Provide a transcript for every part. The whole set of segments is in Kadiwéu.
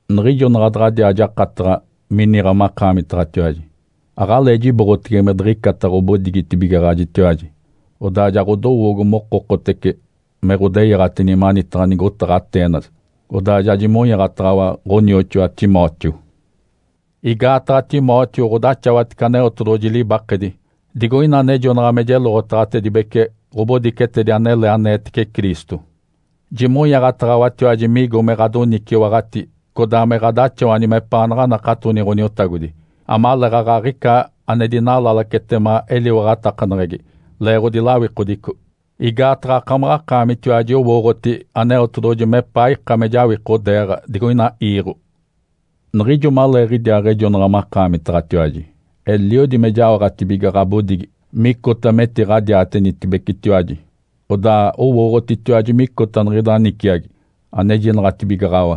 Niɡ̶ijo naɡ̶a daɡ̶adiaa jakataɡ̶a miniɡ̶a makaamitaɡ̶atiwaji, aɡ̶alee jiboɡ̶atege me diɡ̶icata ɡ̶obodigitibigaɡ̶ajitiwaji. Odaa ja ɡ̶odowoogo mokokotece me ɡ̶odeyaɡ̶atini manitaɡ̶a nigotaɡ̶a Atenas, odaa ja jimonyaaɡ̶ataɡ̶awa ɡ̶onioxoa Timóteo. Igaataɡ̶a Timóteo ɡ̶odaxawatece Aneotedoɡ̶oji libakedi digoina anejonaɡ̶a me jeloɡ̶otaɡ̶atedibece ɡ̶obodicetedi anele aneetece Cristo. Jimonyaaɡ̶ataɡ̶awatiwaji migo me ɡ̶adoniciwaɡ̶ati codaa me ɡ̶adaxawani mepaanaɡ̶a anakatoni Ǥoniotagodi, amaleeɡ̶aɡ̶a aɡ̶ica ane dinalalacetema eliwaɡ̶atakaneɡ̶egi leeɡ̶odi lawikodico. Igaataɡ̶a akamaɡ̶akaamitiwaji owooɡ̶oti Aneotedoɡ̶oji mepaa ika me jawikodeeɡ̶a digoina iiɡ̶o. Niɡ̶ijo maleeɡ̶idiaaɡ̶ejonaɡ̶a makaamitaɡ̶atiwaji, eliodi me jaoɡ̶atibiga ɡ̶abodigi micota metiɡ̶adiatenitibecitiwaji. Odaa owooɡ̶otitiwaji micota niɡ̶ida niciagi anejinaɡ̶atibigaɡ̶awa.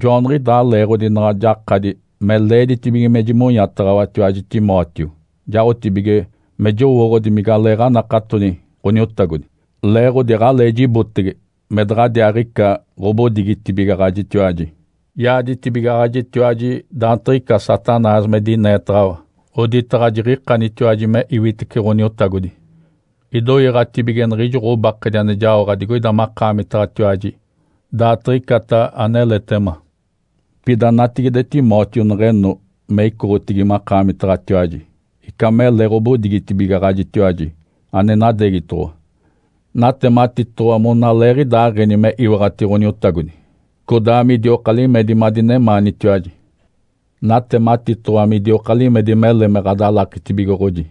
Joaniɡ̶idaa leeɡ̶odi naɡ̶a jakadi me leeditibige me jimonyataɡ̶awatiwaji Timóteo jaotibige me jowooɡ̶odi migaleeɡ̶anakatoni Ǥoniotagodi, leeɡ̶odi aɡ̶alee jibotege me daɡ̶adiaaɡ̶ica ɡ̶obodigitibigaɡ̶ajitiwaji. Yaaditibigaɡ̶ajitiwaji daantiɡ̶ica Satanás me dineetaɡ̶awa, oditaɡ̶a jiɡ̶ikanitiwaji me iwitece Ǥoniotagodi, idoiiɡ̶atibige niɡ̶ijo ɡ̶obakedi ane jaoɡ̶a digoida makaamitaɡ̶atiwaji daatiɡ̶icata aneletema. Pida natigide Timóteo neɡ̶eno me icoɡ̶otigi makaamitaɡ̶atiwaji, ica mele ɡ̶obodigitibigaɡ̶ajitiwaji ane nadeegitoɡ̶owa, natematitoɡ̶owa monaleeɡ̶idaaɡ̶eni me iwaɡ̶ati Ǥoniotagodi, codaa midioka limedi madinemaanitiwaji. Natematitoɡ̶owa midioka limedi mele me ɡ̶adalakitibigoɡ̶oji,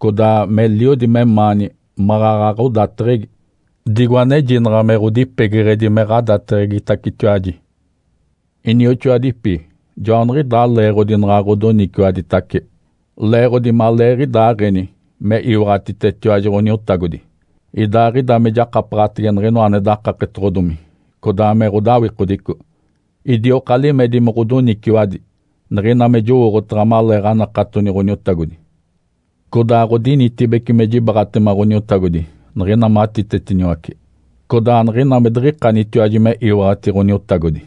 codaa meliodi memaani maɡ̶aɡ̶a ɡ̶odateɡ̶egi, digo anejinaɡ̶a me ɡ̶odipegeɡ̶edi me ɡ̶adateɡ̶egitacetiwaji. Inioxoadipi. Joaniɡ̶idaa leeɡ̶odi naɡ̶a ɡ̶odoniciwaditace leeɡ̶odi maleeɡ̶idaaɡ̶eni me iwaɡ̶atitetiwaji Ǥoniotagodi, idaaɡ̶ida me jakapaɡ̶atege niɡ̶inoa ane dakapetoɡ̶odomi codaa me ɡ̶odawikodico. Idioka limedi me ɡ̶odoniciwadi niɡ̶ina me jowooɡ̶otaɡ̶a maleeɡ̶anakatoni Ǥoniotagodi. Codaa ɡ̶odinitibece me jibaaɡ̶atema Ǥoniotagodi niɡ̶ina matitetiniwace, codaa niɡ̶ina me diɡ̶ikanitiwaji me iwaɡ̶ati Ǥoniotagodi.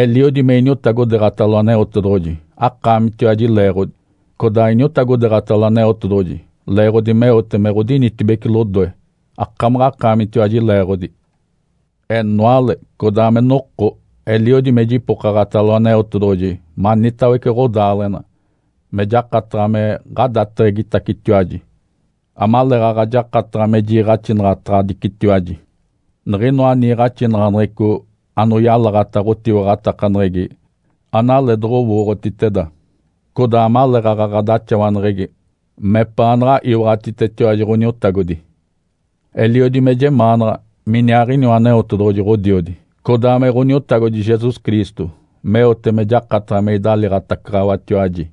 Eliodi me iniotagodeeɡ̶atalo Aneotedoɡ̶oji akaamitiwaji leeɡ̶odi, codaa iniotagodeeɡ̶atalo Aneotedoɡ̶oji leeɡ̶odi meote me ɡ̶odinitibece lodoe, akamaɡ̶akaamitiwaji leeɡ̶odi. Enoale, codaa me noko, eliodi me jipokaɡ̶atalo Aneotedoɡ̶oji manitawece ɡ̶odaaleɡ̶ena me jakataɡ̶a me ɡ̶adateɡ̶egitacetiwaji, amaleeɡ̶aɡ̶a jakataɡ̶a me jiiɡ̶axinaɡ̶ataɡ̶adicitiwaji niɡ̶inoa niiɡ̶axinaɡ̶aneɡ̶eco anoyalaɡ̶ata ɡ̶otiwaɡ̶atakaneɡ̶egi analee doɡ̶owooɡ̶otiteda, codaa amaleeɡ̶aɡ̶a ɡ̶adaxawaneɡ̶egi mepaanaɡ̶a iwaɡ̶atitetiwaji Ǥoniotagodi. Eliodi me jemaanaɡ̶a miniaaɡ̶iniwa Aneotedoɡ̶oji Ǥodiodi, codaa me Ǥoniotagodi Jesus Cristo meote me jakataɡ̶a me idaliiɡ̶atacaɡ̶awatiwaji.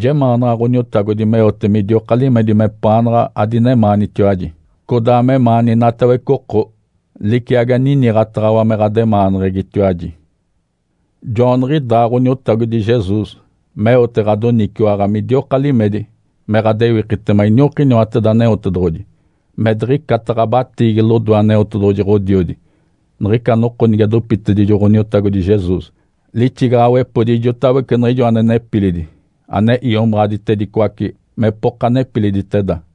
Jemaanaɡ̶a Ǥoniotagodi meote midioka limedi mepaanaɡ̶a adinemaanitiwaji, codaa memaani inatawece oko, liciagi aniniɡ̶ataɡ̶awa me ɡ̶ademaaneɡ̶egitiwaji. Joaniɡ̶idaa Ǥoniotagodi Jesus meote ɡ̶adoniciwaɡ̶a midioka limedi me ɡ̶adewikitema iniokiniwateda Aneotedoɡ̶oji, me diɡ̶icata ɡ̶abatiigi lodoe Aneotedoɡ̶oji Ǥodiodi, niɡ̶ica noko nige dopitedijo Ǥoniotagodi Jesus lixigaɡ̶awepodi ijotawece niɡ̶ijo ane nepilidi, ane iomaɡ̶aditedicoace mepoka nepiliditeda.